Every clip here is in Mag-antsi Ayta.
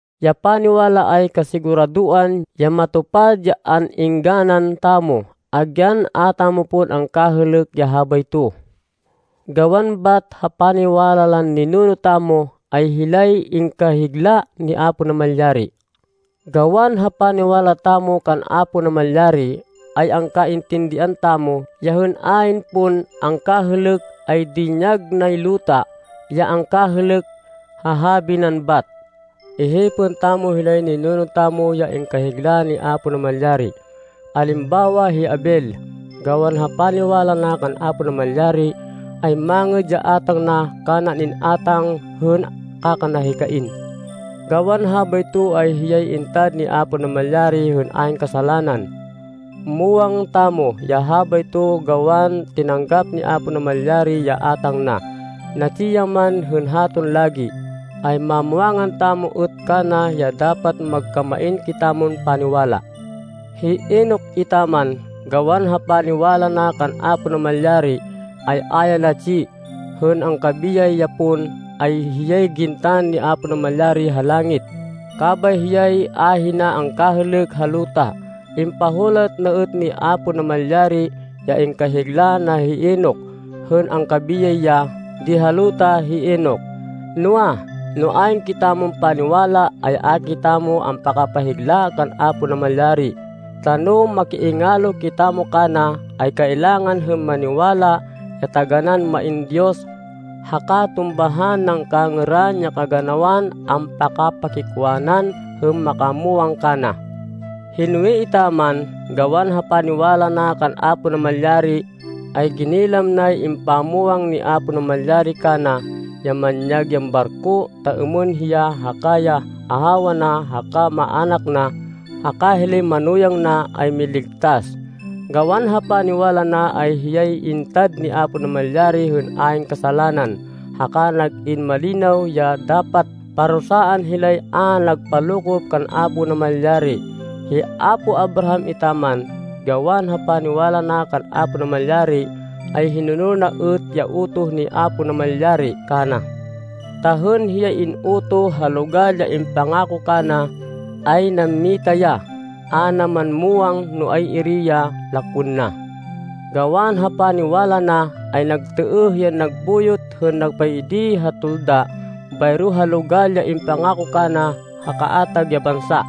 Ya paniwala, ay kasiguradoan ya matupad ya an-êngganan tamo, agyan a tamo pon angkahêlêk ya habayto. Gawan bat ha paniwala lan ninuno tamo, ay hilay ingkahigla ni Apo Namalyari. Gawan ha paniwala tamo kan Apo Namalyari, ay angkaintindihan tamo ya hên ayn pon angkahêlêk, ay dinyag nay luta ya angkahêlêk, ha habi nan bat. Ihipên tamo hilay ninuno tamo ya ingkahigla ni Apo Namalyari. Alimbawa hi Abel, gawan ha paniwala na kan Apo Namalyari, ay mangêd ya átang na kanan in-átang hên kaka na hi Cain. Gawan habayto ay hiyay intad ni Apo Namalyari hên ayn kasalanan. Muwang tamo ya habayto gawan tinanggap ni Apo Namalyari ya átang na. Natsi ya man hên haton lagi, ay mamwangan tamo êt kana ya dapat magkamain kitamon paniwala. Hi Enoc etaman, gawan ha paniwala na kan Apo Namalyari, ay a ya natsi. Hên angkabiyay ya pon, ay hiyay gintan ni Apo Namalyari ha langit, kabay hiyay ahina angkahêlêk ha luta. Impahulat na êt ni Apo Namalyari, ya ingkahigla na hi Enoc, hên angkabiyay ya di ha luta hi Enoc. Noa, no ayn kitamon paniwala, ay a kitamo ampakapahigla kan Apo Namalyari, ta no makiingalo kitamo kana, ay kailangan hên maniwala ya taganán main Diyos, haka tumbahan nan kangêran ya kaganawan ampakapakikwanan hên makamwang kana. Hi Noe etaman, gawan ha paniwala na kan Apo Namalyari, ay ginilam nay impamwang ni Apo Namalyari kana, ya manyag yan barko, ta êmên hiya haka ya ahawa na haka maának na, haka hilay manuyang na ay miligtas. Gawan ha paniwala na ay hiyay intad ni Apo Namalyari hên ayn kasalanan, haka nag-in malinaw ya dapat parusaan hilay a nagpalokop kan Apo Namalyari. Hi apo Abraham etaman, gawan ha paniwala na kan Apo Namalyari, ay hinonol na êt ya utoh ni Apo Namalyari kana. Ta hên hiyay in-utoh ha logal ya impangako kana, ay nammita ya, a na man muwang no ay-iri ya lakwên na. Gawan ha paniwala na, ay nagtêêh yan nagbuyot hên nagpaidi ha tolda bayro ha logal ya impangako kana ha kaatag ya bansa.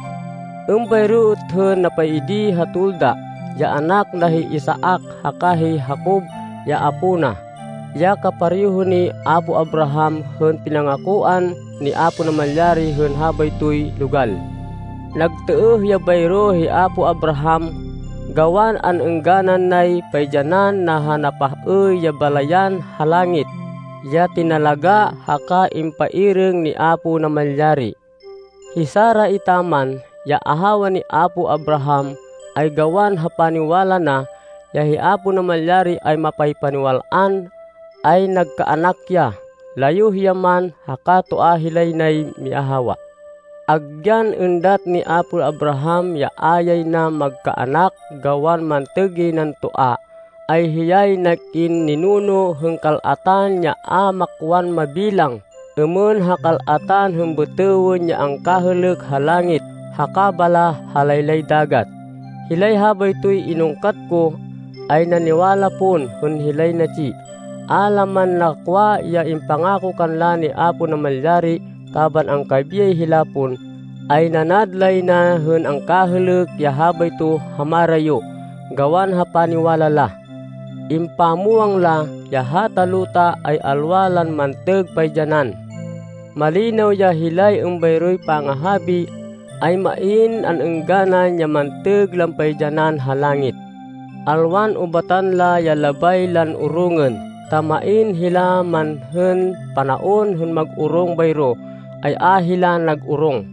Êmbayro êt hên nagpaidi ha tolda, ya anak na hi Isaac haka hi Jacob ya apó na, ya kapareho ni apo Abraham hên pinangakoan ni Apo Namalyari hên habaytoy logal. Nagtêêh ya bayro hi apo Abraham, gawan an-êngganan nay paidyanan na ha napah-êy ya balayan ha langit, ya tinalagá, haka impairêng ni Apo Namalyari. Hi Sara etaman, ya ahawa ni apo Abraham, ay gawan ha paniwala na, ya hi Apo Namalyari ay mapaypaniwal-an, ay nagkaanak ya, layuh ya man haka toa hilay nay miahawa. Agyan êndat ni apo Abraham ya a yay na magkaanak gawan mantêg yay nan toa, ay hiyay nag-in ninuno hên kal-atan ya a makwan mabilang êmên ha kal-at hên bêtêwên ya angkahêlêk ha langit haka baláh ha laylay dagat. Hilay habaytoy inungkat ko, ay naniwala pon hên hilay natsi. A la man nakwa ya impangako kanla ni Apo Namalyari kaban angkabiyay hila pon, ay nanad lay na hên angkahêlêk ya habayto ha marayo, gawan ha paniwala la. Impamwang la ya hata luta ay alwa lan mantêg paidyanan. Malinaw ya hilay êmbayroy pangahabi, ay main an-êngganan ya mantêg lan paidyanan ha langit. Alwan ubatan la ya labay lan orongên, ta main hila man hên panaon hên mag-orong bayro, ay a hila nag-orong.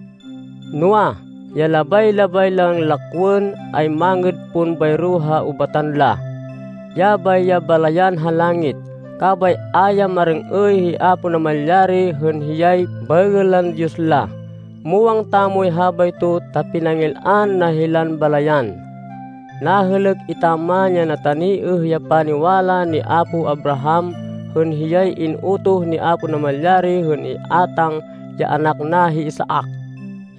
Noa, ya labay-labay lan lakwên, ay mangêd pon bayro ha ubatan la. Yabay ya balayan ha langit. Kabay a ya marêng-êy hi Apo Namalyari hên hiyay baêgên lan Diyos la. Muwang tamoy habayto ta pinangil-an na hilan balayan. Nahêlêk etaman ya nataniêh ya paniwala ni apo Abraham, hên hiyay in-utoh ni Apo Namalyari hên iátang ya anak na hi Isaac.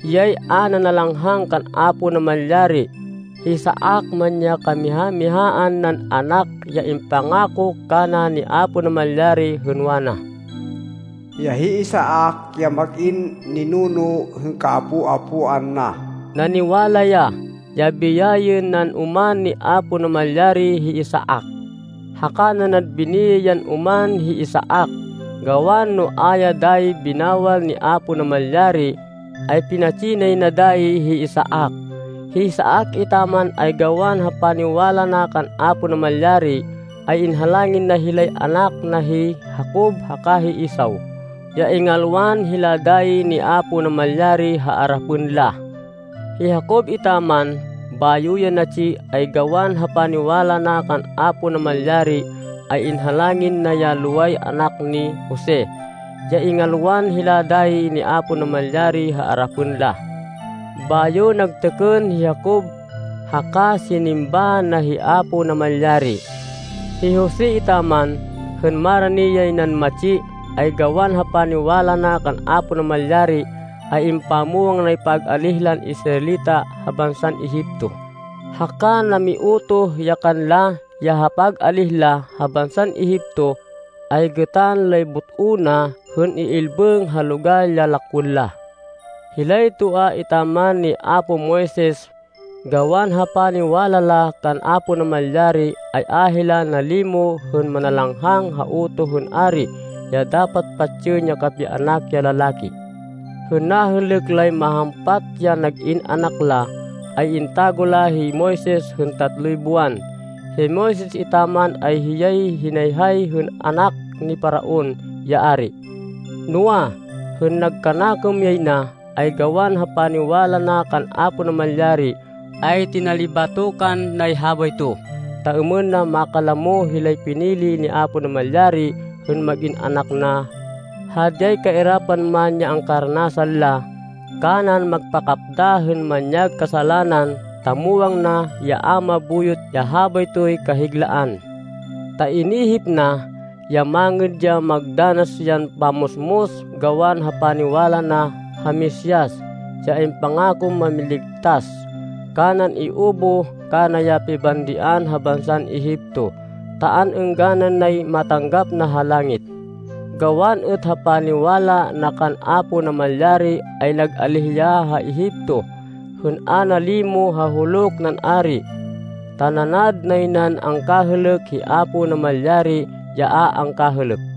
Hiyay a nanalanghang kan Apo Namalyari, hi Isaac man ya kamiha-mihaan nan anak ya impangako kana ni Apo Namalyari, hên wana, ya hi Isaac ya mag-in ninuno hên kaapo-apoan na. Naniwala ya, ya biyayên nan oman ni Apo Namalyari hi Isaac. Haka nanad biniyay yan oman hi Isaac, gawan no a ya dayi binawal ni Apo Namalyari, ay pinatsi nay na dayi hi Isaac. Hi Isaac etaman, ay gawan ha paniwala na kan Apo Namalyari, ay inhalangin na hilay anak na, hi Jacob haka hi Esau, ya ingalwan hila dayi ni Apo Namalyari ha arapên la. Hi Jacob etaman, bayo ya natsi, ay gawan ha paniwala na kan Apo Namalyari, ay inhalangin na ya loway anak ni Jose, ya ingalwan hila dayi ni Apo Namalyari ha arapên la. Bayo nagtêkên hi Jacob, haka sinimba na hi Apo Namalyari. Hi Jose etaman, hên marani yay nan matsi, ay gawan ha paniwala na kan Apo Namalyari, ay impamwang nay pag-alíh lan Israelita ha bansan Egipto, haka namiutoh ya kanla, ya ha pag-alíh la ha bansan Egipto, ay gêtan lay but-o na hên iilbêng ha logal ya lakwên la. Hilay toa etaman ni apo Moises, gawan ha paniwala la kan Apo Namalyari, ay a hila nalimo hên nanalanghang ha utoh hên ari ya dapat patsên ya kapianak ya lalaki. Hên nahêlêk lay mahampat ya nag-in anak la, ay intago la hi Moises hên tatloy buwan. Hi Moises etaman, ay hiyay hinayhay hên anak ni Faraon, ya ari. Noa, hên nagkanakêm yay na, ay gawan ha paniwala na kan Apo Namalyari, ay tinalibatokan nay habayto, ta êmên na makalamo hilay pinili ni Apo Namalyari hên mag-in anak na, hadyay kairapan man ya angkaranasan la, kanan magpakapda hên manyag kasalanan, ta muwang na ya a mabuyot ya habaytoy kahiglaan. Ta inihip na, ya mangêd ya magdanas yan pammusmus gawan ha paniwala na ha Mesias, ya impangakon Mámiligtas, kanan iubuh kana ya pibandian ha bansan Egipto, ta an-êngganan nay matanggap na ha langit. Gawan êt ha paniwala na kan Apo Namalyari, ay nag-alíh ya ha Egipto, hên a nalimo ha huluk nan ari. Ta nanad nay nan angkahêlêk hi Apo Namalyari ya a angkahêlêk.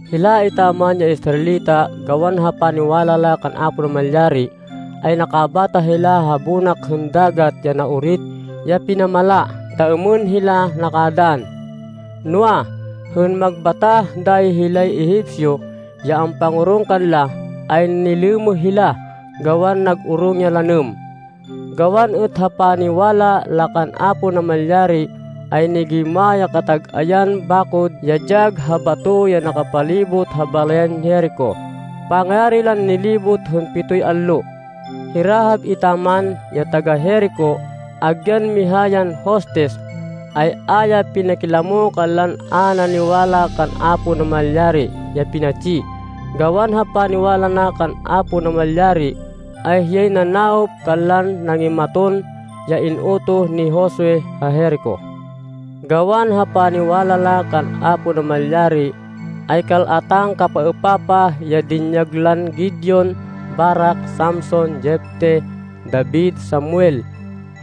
Hila etaman ya Israelita, gawan ha paniwala la kan Apo Namalyari, ay nakabatah hila ha bonak hên Dagat ya Naorit ya pinamala ta êmên hila nakadann. Noa, hên magbatah dayi hilay Egipcio, ya ampangorong kanla, ay nilêmêh hila gawan nag-orong ya lanêm. Gawan êt ha paniwala la kan Apo Namalyari, ay nigêyma ya katag-ayan bakod ya dyag ha bato ya nakapalibot ha balayan Jerico pangayari lan nilibot hên pitoy allo. Hi Rahab etaman, ya taga-Jerico, agyan miha yan hostis, ay a ya pinakilamo kanlan a naniwala kan Apo Namalyari ya pinatsi. Gawan ha paniwala na kan Apo Namalyari, ay hiyay nanawop kanlan nangimaton, ya in-utoh ni Josue ha Jerico. Gawan ha paniwala la kan Apo Namalyari, ay kal-atan kapapaêpapah ya dinyag lan Gideon, Barak, Samson, Jefte, David, Samuel,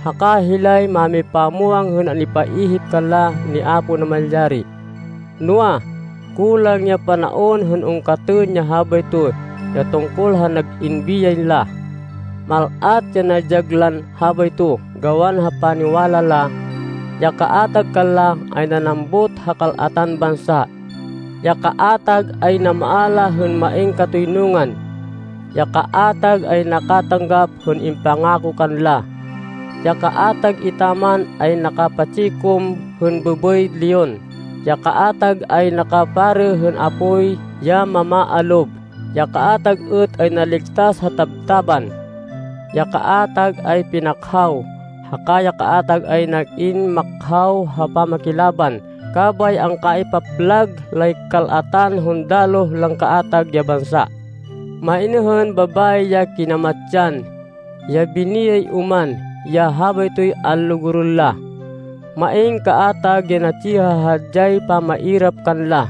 haka hilay mámipamwang hên an-ipaihip kanla ni Apo Namalyari. Noa, kulang ya panaon hên ungkatên ya habayto ya tungkol ha nag-in biyay la. Mal-at ya nadyag lan habayto gawan ha paniwala la. Ya kaatag kanla, ay nanambut ha kal-atan bansa. Ya kaatag ay namaala hên main katoynungan. Ya kaatag ay nakatanggap hên impangako kanla. Ya kaatag etaman ay nakapa-tsikum hên bêbêy leon. Ya kaatag ay nakaparê hên apoy ya mamaalob. Ya kaatag êt ay naligtas ha tabtában. Ya kaatag ay pinakhaw, haka ya kaatag ay nag-in makhaw ha pamakilaban kabay angkaipaplag lay kal-atan hundaloh lan kaatag ya bansa. Main hên babayi ya kinamatsan, ya biniyay oman ya habaytoy anlugurên la. Main kaatag ya natsi ha hadyay pamairap kanla,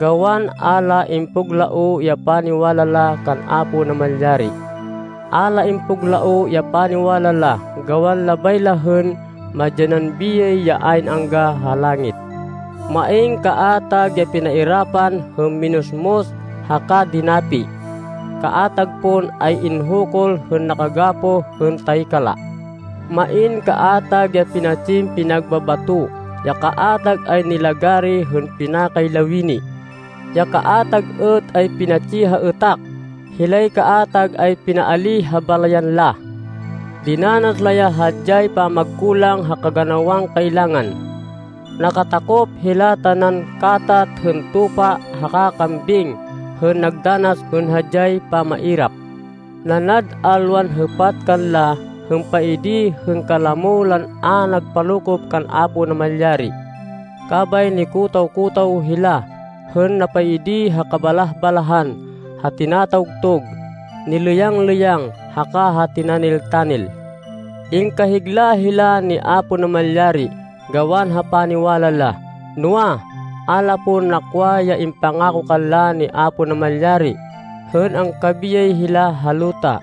gawan a la impuglaoh ya paniwala la kan Apo Namalyari. A la impuglaoh ya paniwala la gawan labay la hên madyanan biyay ya ayn angga ha langit. Main kaatag ya pinairapan hên minusmus, haka dinapi. Kaatag pon ay inhukul hên nakagapoh hên taykala. Main kaatag ya pinatsin pinagbabato. Ya kaatag ay nilagari hên pinakay lawini. Ya kaatag êt ay pinatsi ha êtak. Hilay kaatag ay pinaalíh ha balayan la. Dinanas la ya hadyay pamagkulang ha kaganawan kailangan. Nakatakop hila tanan katat hên tupa haka kambing hên nagdanas hên hadyay pamairap. Nanad alwan hêpat kanla hên paidi hên kalamo lan a nagpalokop kan Apo Namalyari. Kabay nikotaw-kotaw hila hên napaidi ha kabalah-balahan, ha tinatawgtug, nilêyang-lêyang haka ha tinanil-tanil. Ingkahigla hila ni Apo Namalyari gawan ha paniwala la. Noa, a la pon nakwa ya impangako kanla ni Apo Namalyari, hên angkabiyay hila ha luta,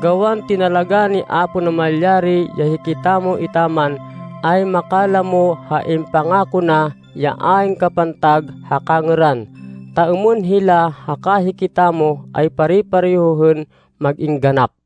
gawan tinalagá ni Apo Namalyari ya hikitamo etaman, ay makalamo ha impangako na, ya ayn kapantag ha kangêran, ta êmên hila haka hikitamo ay pare-pareho hên mag-in ganap.